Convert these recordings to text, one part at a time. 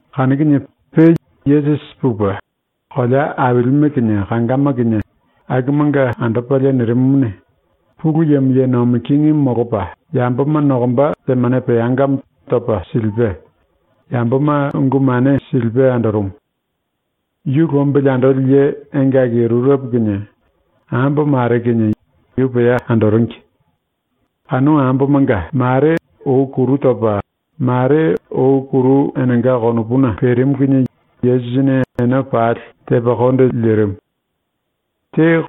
Kanu kinie pe Yesusi pupe, kolea ailime kinie kangama kinie akumanga andopalie nirimumuni, Pulu Yemo ye nomi kingimu molopa yamboma nokomba temane peangamo topa silipe, yamboma ungu mane silipe andorumu. Yu lombili andoli ye engaki rurepo kinie ambo mare kinie yu pea andoringi. Kanu ambomanga mare ou kuru topa, mare ou kuru enenga konopuna perimu kinie Yesusini ene pali tepa konde lirimu. Te,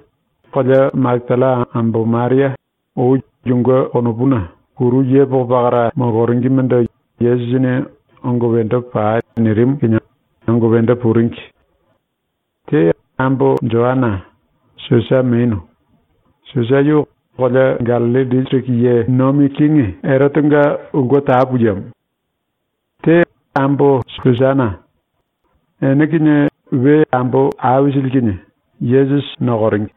kolea Makatalla ambo Maria, ou yunge konopuna kuru yepoko pakara moloringimendo Yesusini “Ongo wendo pai.” nirimu kinie ongo wendo puringi. Te, ambo Joana, Susa menu. Susa yu kolea Gallilli disiriki ye nomi kingi Erotenga ulke tapu yemo. Te, ambo Susana. Ene kinie we ambo aisili kinie Yesusi nokoringi.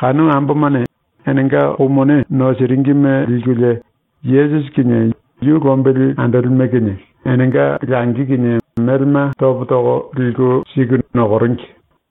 Kanu ambomane enenga kou mone nosiringime likulie Yesusi kinie yu lombili andolime kinie enenga langi kinie melema topo toko liku siku nokoringi.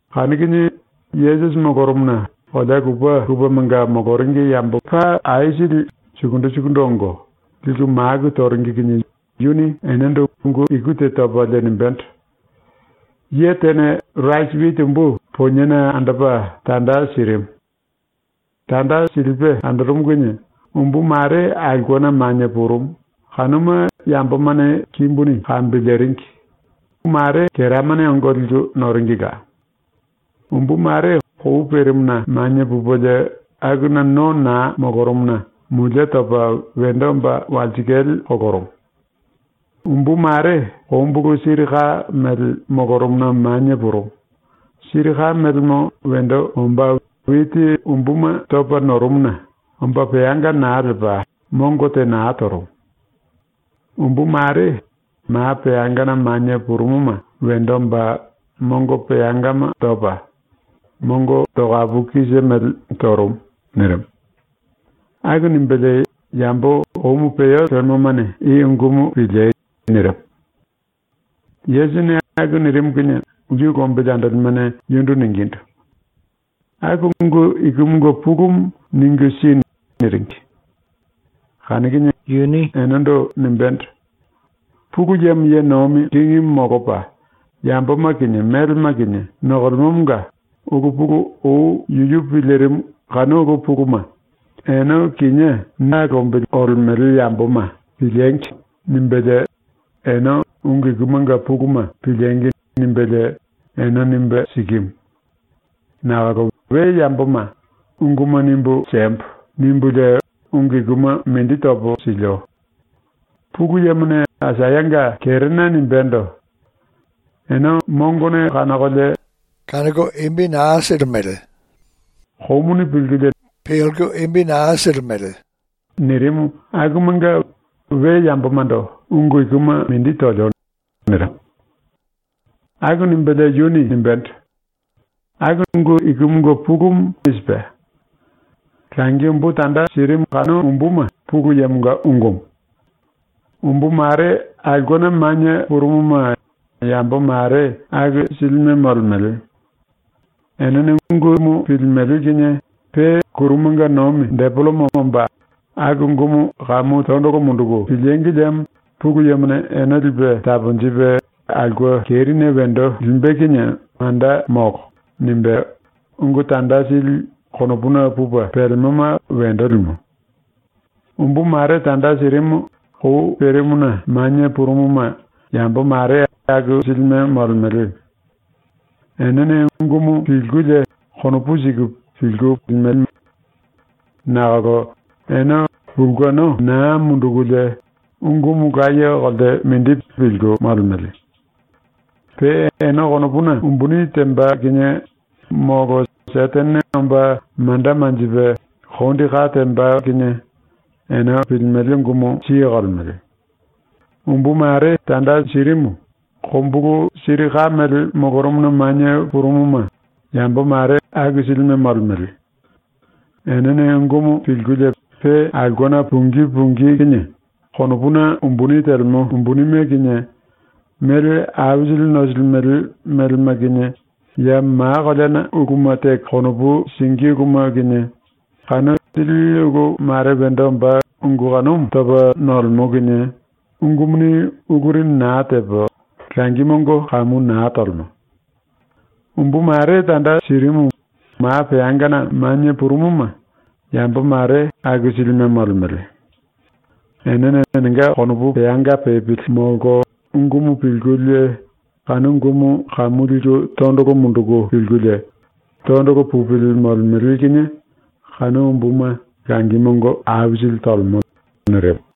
Kanu kinie Yesusi molorumuna kolea lupe lupemanga moloringi yamboma sukundu sukundu ongo, liku maku toringi kinie yuni enendo ungu iku te topalie nimbendo: “Ye tene rasi witi umbu poniena andopa tanda sirimu. Tanda silipe andorumu kinie umbu mare aulkena manie purumu, kanuma yambomane kimbuni kambiliringi; keramane ongo liku noringila. Umbu mare kou perimuna manie pupelie akuna no naa molorumuna mulie topa wendo omba walsikale kolorumu. Umbu mare kombulu siri ka mele molorumuna manie purumu, siri ka melemo wendo omba witi umbuma topa norumuna omba peanga naa lepa ⸤mongo te naa torumu⸥. Umbu mare ma peangana manie purumuma wendo omba mongo peangama topa, mongo tokapu kise mele torumu.” ⸤nirimu.⸥ ⸤Aku nimbelie⸥ “Yambo komu peo lemomane i ungumu piliei.” nirimu. ⸤Yesusini aku nirimu kinie⸥ yu lombili andolimene yundu ningindu: “Aku ungu ikumunge pulumu ningu si.” niringi. Kanu kinie yuni enendo nimbendo: “Pulu Yemo ye nomi kingimu molopa yamboma kinie melema kinie nokolemomonga ulu pulu ou yuyu pilirimu kanu ulu puluma ‘Ene kinié ⸤na lombili olemele yamboma⸥ piliengi!’ nimbelie ene ‘Ungu ikumanga puluma piliengi!’ nimbelie ene nimbe sikimu. Nakolo we yamboma ‘Unguma nimbu siembo.’ nimbulie ungu ikuma mindi topo silio. ⸤Pulu Yemone Aisayanga kerena nimbendo:⸥ ‘Ene mongone kanokolie naa kanoko, komuni pilkulie naa pilimele.’ nirimu akumunge we yambomando ungu ikuma mindi tolio.” nirimu. Aku nimbelie yuni nimbendo: “Aku ungu ikumunge pulumu i sipe: “Langi umbu tanda sirimu kanu umbuma Pulu Yemonga ungumu. Umbu mare aulkena manie purumuma yambo mare aku silime molemele. Enene ungumu pilimele kinie pe ⸤kurumanga nomi⸥ depelemo omba ‘Aku ungumu kamu tondolo munduku pilíngi liemo Pulu Yemone ene lipe taponjipe aulke kerine wendo limbe kinie manda molo.’ nimbe ungu tanda sili konopuna pupe pelemoma wendo limo. Umbu mare tanda sirimu kou perimuna manie purumuma yambo mare aku silime molemele. Enene ungumu pilkulie konopu siku pilku limele. Nakolo ene pulkeno naa mundukulie ungumu laye kolte mindi pilku molemele. Pe ene konopuna umbuni temba kinie molo ⸤Setene omba⸥ manda manjipe kondi ka temba kinie, ene pilimele ungumu siye kolemele. Umbu mare tanda sirimu kombulu siri ka mele molorumuna manie purumuma yambo mare aku silime molemele. Enene ungumu pilkulie pe aulkena pungí pungí kinie konopuna umbuni telemo umbunime kinie, mele aisili nosilimele melema kinie ya ma koleana uluma teko konopu singí uluma kinie, kanu sili ulu mare wendo omba ungu kanumu topa nolemo kinie ungumuni uluri naa tepa langi mongo kamu naa tolemo. Umbu mare tanda sirimu ma peangana manie purumuma yambo mare aku silime molemele. Enene enenga konopu peanga pepili molko ungumu pilkulie kanu ungumu kamu liku tondolo munduku pilkulie, tondolo pupili molemele kinie kanu umbuma langi mongo ⸤aisili⸥ tolemo.” ⸤nirimu.⸥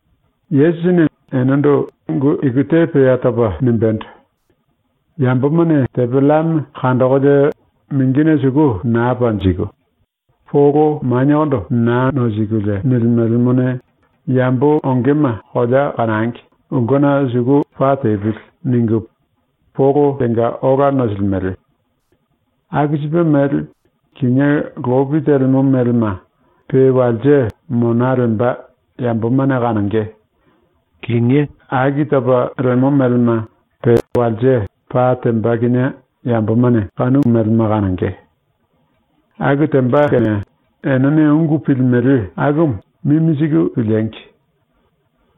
⸤Yesusini enendo ungu iku te pea topa nimbendo:⸥ “Yambomane tepe llame kandokolie mingine suku naa panjiku polo maniekondo naa nosikulie nilimelemone, ‘Yambo ongema kolea kanangi ulkena suku pa tepili.’ ningu polo tenga ola nosilimele. Aku sipe mele, kinié lopi telemo melema pe walse mona lemba yamboma kanonge; kinié aki topa lemo melema pe walse pa temba kinie yambomane kanu melema kanonge. “Aku temba kene enene ungu pilimele akumu mimi siku piliengi!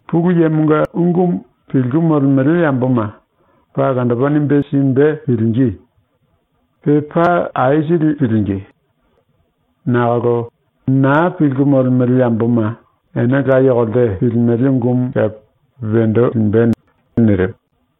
Pulu Yemonga ungumu pilku molemele yamboma paa olandopa nimbe simbe pilingí. Pe paa aisili pilingí. Nakolo naa pilku molemele yamboma ene laye kolte pilimele ungumu kepe wendo limbe.” nirimu.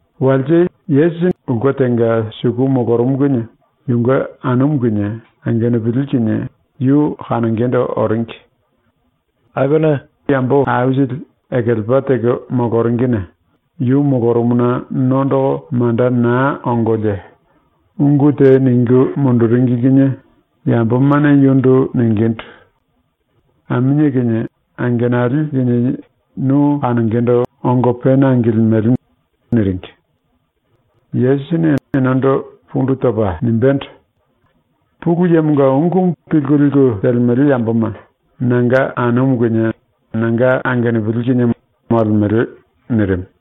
Walse Yesusi ulke tenga suku molorumu kinie yunge anumu kinie angenupili kinie yu kanongendo oringi. Akuna yambo aisili ekelepa teko moloringine yu molorumuna nondoko manda naa ongolie ⸤ungu te ningu munduringi kinie⸥ yambomane yundu ningindu: “Aminie kinie angenali kinie nu kanongendo ongo pena angilimele.” niringi. Yesusini enendo pundu topa nimbendo: “Pulu Yemonga ungumu pilku liku telemele yamboma nanga anumu kinie nanga angenupili kinie molemele.” nirimu.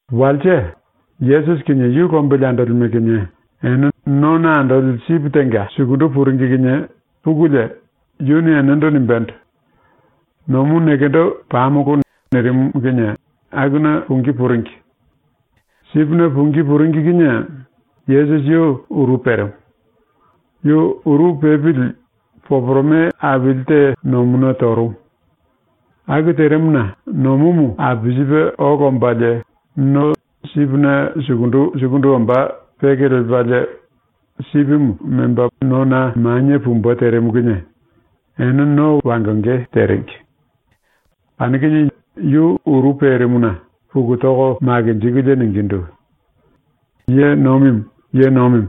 Walse, Yesusi kinie yu lombili andolime kinie ene nona andoli sipi tenga sukundu puringi kinie pukulie, yuni enendo nimbendo: “Nomu nekendo pamolo.” nirimu kinie akuna pungí puringi. Sipine pungí puringi kinie Yesusi yu uru perimu. Yu uru pepili poporome aili te nomuna torumu. Aku terimuna ⸤nomumu apisipe ola ombalie⸥ no sipine sukundu sukundu omba peke lepalie sipimu memba nona manie pumbe terimu kinie ene no wangonge teringi. Kanu kinie yu uru perimuna puku toko makinjikulie ningindu: “Ye Nomimu, Ye Nomimu,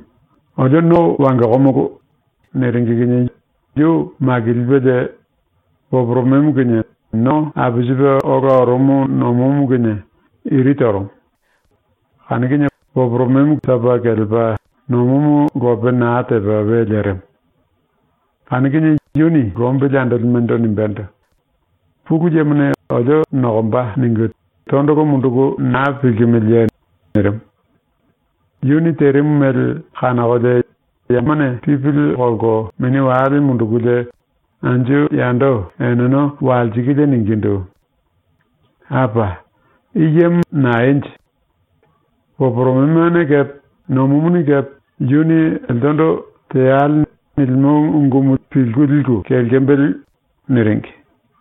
olio no wangokomolo.” niringi kinie yu makilipelie poporomemo kinie no apisipe ola orumu nomumu kinie iri torumu. Kanu kinie poporomemo topa kelepa, nomumu lope naa tepa we lerimu. Kanu kinie yuni lombili andolimendo nimbendo: “‘⸤Pulu Yemone olio nokomba.’ ningu⸥ tondolo munduku naa pilkimiliye?” nirimu. ⸤Yuni terimu mele kanokolie⸥ yemane pipili kolko mini wale mundukulie anju yando eneno walsikulie ningindu: “Apa! I yemo naenje? Poporomemone kepe nomumuni kepe yuni eltendo “Teale.” nilimo ungumu pilku liku kelkembele.” niringi.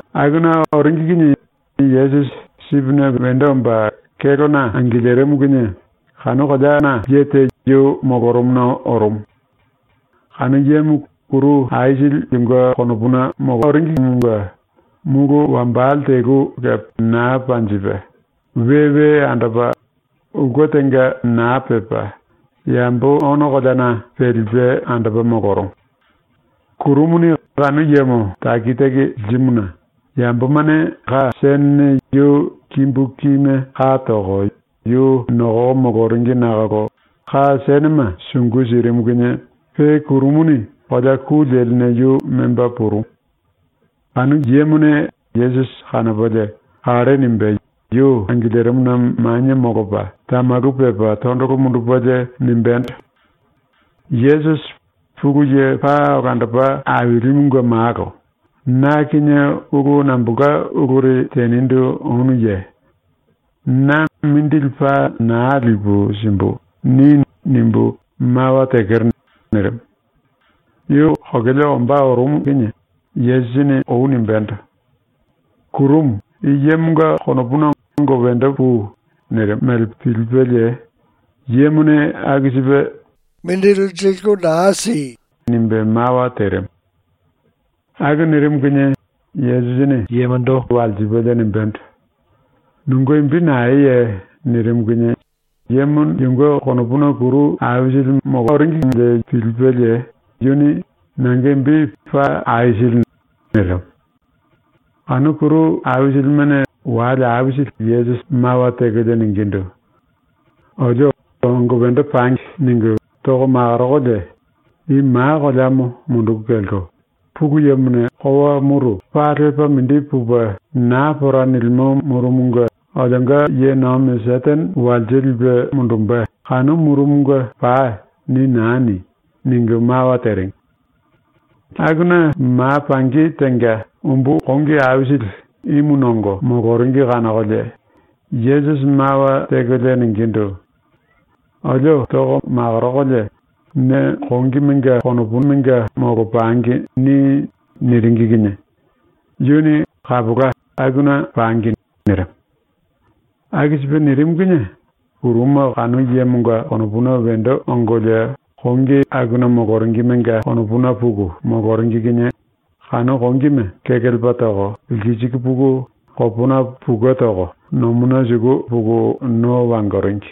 Akuna oringi kinie Yesusi sipine wendo omba kélona angilirimu kinie kanu kolea ye te yu molorumuna orumu. Kanu yemo kuru aisili yunge konopuna molorumumunge mulu wambale telu kepe naa panjipe, we we andopa, ulke tenga naa pepa, yambo ono koleana pelipe andopa molorumu. Kurumuni kanu yemo taki taki lirimuna yambomane ka senene yu kimbu kime ka toko yu nokoko moloringi nakolo ka senema sungu sirimu kinie pe kurumuni kolea ku leline yu memba purumu. Kanu yemone Yesusi kanopalie kalle nimbe yu angilirimuna manie molopa tamalu pepa tondolo mundupelie nimbendo: “Yesusi, Pulu Ye Paa Olandopa Ailimunge Malo, na kinie ulu nambolka uluri tenindu onuye? ‘ “Na mindili paa naa lipu simbu.” ni.’ nimbu mawa tekero.” nirimu. ⸤Yu kokele ombá orumu kinie⸥ Yesusini ou nimbendo: “Kurumu, i yemonga konopuna ongo wendo pui.” nirimu mele pilipelie yemone aku sipe “Naa tei.” nimbe mawa terimu. Aku nirimu kinie Yesusini yemondo walsipelie nimbendo: “Nunge imbi naeye?” nirimu kinie yemo yunge konopuna kuru aisili molorumuna pilipelie yuni “Nanga imbi Paa Aisili.” nirimu. Kanu kuru aisilimene wale aisili Yesusi mawa tekolie ningindu: “Olio ‘ongo wendo pangi.’ ningu toko makorokolie “⸤I ma koleamo munduku kelko⸥ Pulu Yemone kowa muru paa lepa mindi pupe naa pora nilimo murumunge ⸤olionga ye nomi Setene walse lipe mundumbe⸥ kanu murumunge pai.” ni naa ni.” ningu mawa teringi. Akuna ma pangi tenga umbu kongi aisili ímu nongo moloringi kanokolie Yesusi mawa tekolie ningindu: “Olio ⸤toko makorokolie⸥ ‘Ne kongimenga konopuna molopangi.’ ni.” niringi kinie yuni “Kapola, akuna pangi.” nirimu. Aku sipe nirimu kinie kuruma kanu yemonga konopuna wendo ongolie kongi akuna moloringimenga konopuna puku moloringi kinie kanu kongime kekelepa toko lkisiku puku kopona pukue toko nomuna suku puku no wangoringi.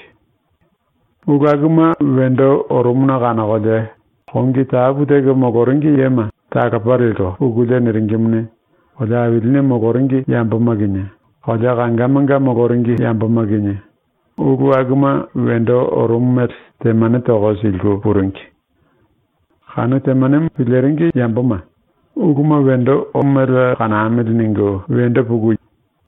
Ulu akuma wendo orumuna kanokolie kongi tapu teko moloringi yema talopa lelko pukulie niringimuni, kolea ailine moloringi yamboma kinie, kolea kangamanga moloringi yamboma kinie, ulu akuma wendo orumu mele temanemo toko siliku puringi. Kanu temanemo piliringi yamboma ‘Uluma wendo orumu mele kanamili.’ ningu wendo puku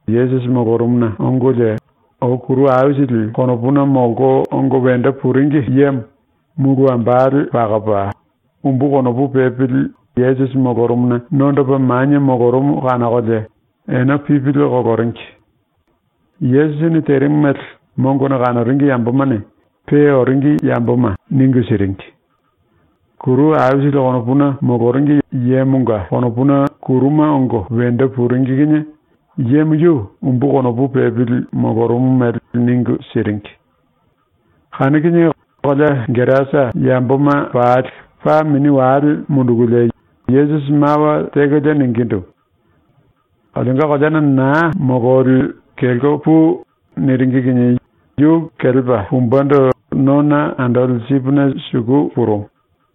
Yesusi molorumuna ongolie ou kuru aisili konopuna molko ongo wendo puringi yemo mulu wambale pakopa, umbu konopu pepili Yesusi molorumuna nondopa manie molorumu kanokolie ene pipili koloringi. Yesusini terimu mele mongone kanoringi yambomane pe oringi yamboma ningu siringi. Kuru aisili konopuna moloringi yemonga konopuna kuruma ongo wendo puringi kinie yemo yu umbu konopu pepili molorumu mele ningu siringi. Kanu kinie kolea Gerasa yamboma pali paa mini wale mundukulie Yesusi mawa tekolie ningindu: “Olionga koleana naa mololi kelko pui.” niringi kinie yu kelepa pumbendo nona andoli sipine suku purumu.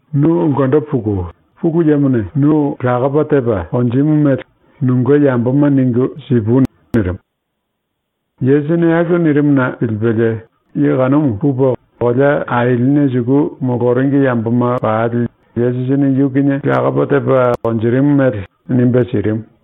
“Nu ulkendo puku Pulu Yemone nu lakopa tepa konjimu mele nunge yamboma ningu sipui.” nirimu. Yesusini aku nirimuna pilipelie ye kanumu pupe kolea ailine suku moloringi yamboma pali Yesusini yu kinie lakopa tepa konjirimu mele nimbe sirimu.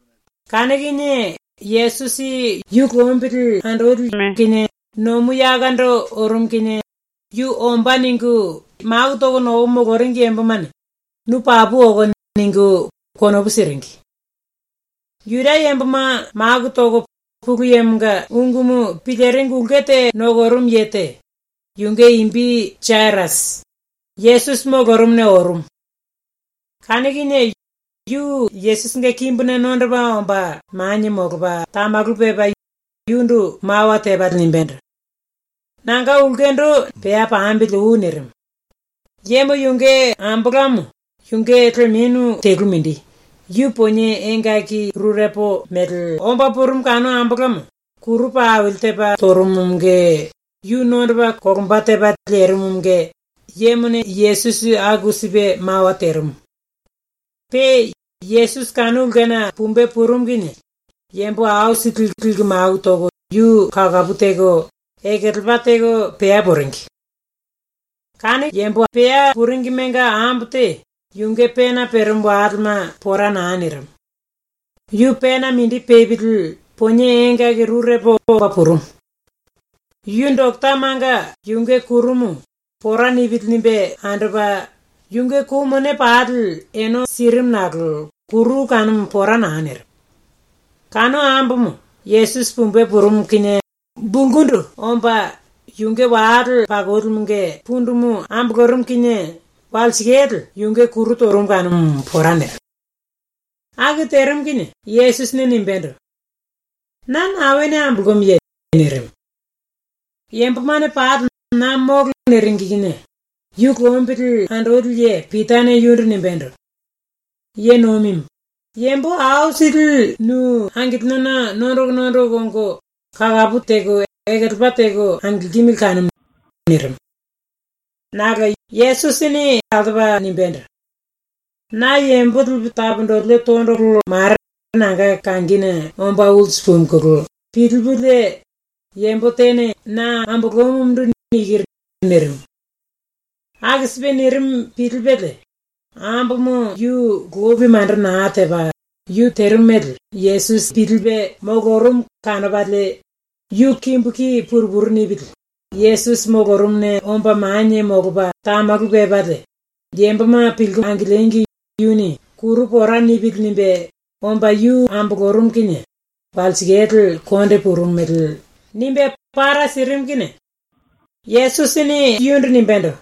Kanu kinie Yesusi yu nomu yakondo orumu kinie yu ‘Ombá.’ ningu maku toko nokoko moloringi yambomane “Nu papu okono.” ningu konopu siringi. Juda yamboma maku toko Pulu Yemonga ungumu piliringi ulke te nokorumu ye te, yunge imbi Jairasi, Yesusi molorumuna orumu. Kanu kinie yu Yesusinge kimbuna nondopa omba manie molopa tamalu pepa yundu mawa tepalie nimbendo: “Nanga ulkendo pea pambili oi.” nirimu. Yemo yunge ambolamo, yunge lemenu telu mindi, yu ponie engaki rurepo mele omba purumu kanu ambolamo, kuru paa aili tepa torumumunge yu nondopa kolomba tepa lerimumunge ⸤yemone Yesusi aku sipe mawa terimu.⸥ Pe Yesusi kanu ulkena pumbe purumu kinie yambo aisili liku maku toko yu kakapu teko ekelepa teko pea puringi. Kanu yambo pea puringimenga ambo te yunge pena perimu walema pora naa nirimu. Yu pena mindi pepili ponie engaki rurepo omba purumu. Yu doketamanga yunge kurumu ‘Pora nipili.’ nimbe andopa, yunge kou mone pali ene sirimu nakolo kuru kanumu pora naa nirimu. Kanu ambomo Yesusi pumbe purumu kinie bulkundu omba, yunge wale pakolimunge pundumu ambolorumu kinie walsikale yunge kuru torumu kanumu pora nirimu. Aku terimu kinie Yesusini nimbendo: “Na naene ambolomuye?” nirimu. Enene pali “Na molo.” niringi kinie ⸤yu lombili andoli ye⸥ Pitane yundu nimbendo: “Ye Nomimu, yambo aisili nu angilinona nondoko nondoko ongo kakapu teko ekelepa teko angilkimili kanumu.” nirimu. Nakolo Yesusini altopa nimbendo: “Na yambo lipu taponjilio tondolo mare nanga kangine omba ulsu pumuna pilipulie yambo tene na ambolomumundu nikiru.” nirimu. Aku sipe nirimu pilipelie ambomo yu lopi manda naa tepa, yu terimu mele Yesusi pilipe molorumu kanopalie yu kimbu ki pungu pungu nipili Yesusi molorumuna omba manie molopa tamalu pepalie, yamboma pilku angiliengi yuni ‘Kuru pora nipili.’ nimbe omba yu ambolorumu kinie walsikale konde purumu mele nimbe para sirimu kinie Yesusini yundu nimbendo: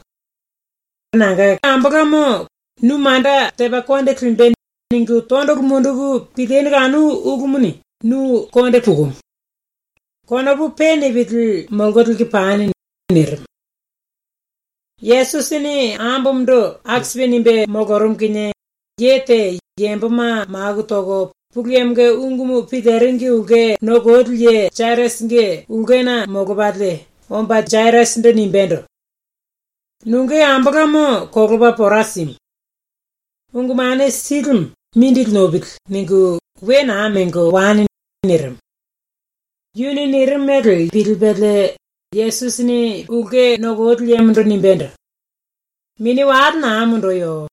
“Ambomo, ‘Nu manda tepa konde limbe.’ ningu tondolo munduku pilinu kanu ulumuni nu konde pukunu. Konopu pe nipili mololiku pani.” nirimu. Yesusini ambomondo aku sipe nimbe molorumu kinie, ye te, yamboma maku toko Pulu Yemonga ungu piliringi ulke nokoli ye ⸤Jairasi⸥ nge ulkena molopalie omba ⸤Jairasindu⸥ nimbendo: “Nunge ambolamo kolopa pora simu. Ungu Mane Silimu ‘Mindili nopili.’ ningu we naa mengo wani.” nirimu. Yuni nirimu mele Yesusini pilipelie ⸤ulke nokoli yemondo⸥ nimbendo: “Mini wale naa munduyo.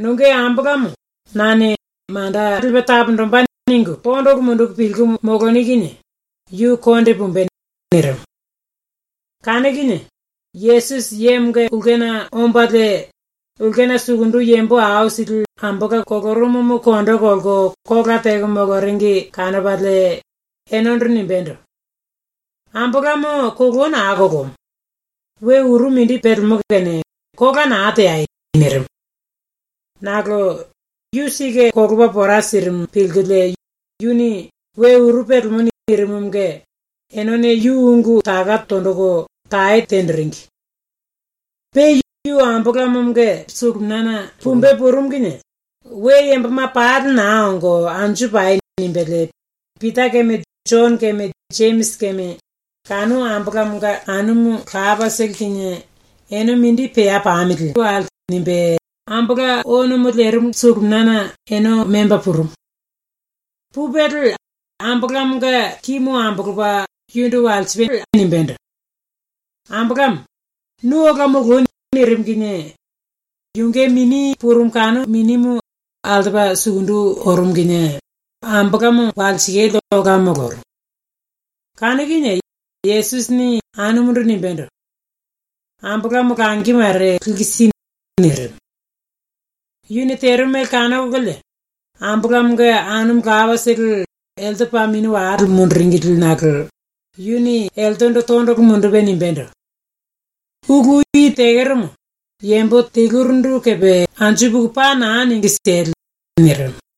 Nunge ambolamo nane ‘Manda lipe taponjimbe.’ ningu tondolo munduku pilku moloni kinie yu konde pumbe.” nirimu. Kanu kinie Yesusi yemonga ulkena ombalie ulkena sukundu yambo aisili ambola kolorumumu kondo kolko kola teko moloringi kanopalie enendo nimbendo: “Ambolamo kolou naa kolomu. We uru mindi pelemo kene kola naa teai.” nirimu. Nakolo yu sike kolopa pora sirimu pilkulie yuni “We uru pelemo.” nirimumunge enene yu ungu taka tonjiku tae tenjiringi. Pe yu ⸤ambolamonga suluminiana⸥ pumbe purumu kinie ‘We yamboma pali naa ongo anju pai.’ nimbelie Pita keme, Jono keme, Jemisi keme, kanu ambolamonga anumu lapatolo kinie “Ene mindi pea pamili.” nimbe ⸤ambola onomo lerimu⸥ suluminiana ene memba purumu. Pupelie ambolamonga kimu ambolopa yundu walsipelie nimbendo: “Ambolamo, nu ola moloi.” nirimu kinie yunge mini purumu kanu minimu altopa sukundu orumu kinie ambolamo walsikale ola molorumu. Kanu kinie Yesusini ⸤anumundu⸥ nimbendo: “Ambolamo langi mare liku si.” nirimu. Yuni terimu mele kanokololie ambolamonga anumu lapatolo elte paa mini wale munduringili nakolo yuni eltendo tondolo mundupe nimbendo: “Ulu i tekeromo yambo telurindu kepe anju puku paa naa ningu siele.” nirimu.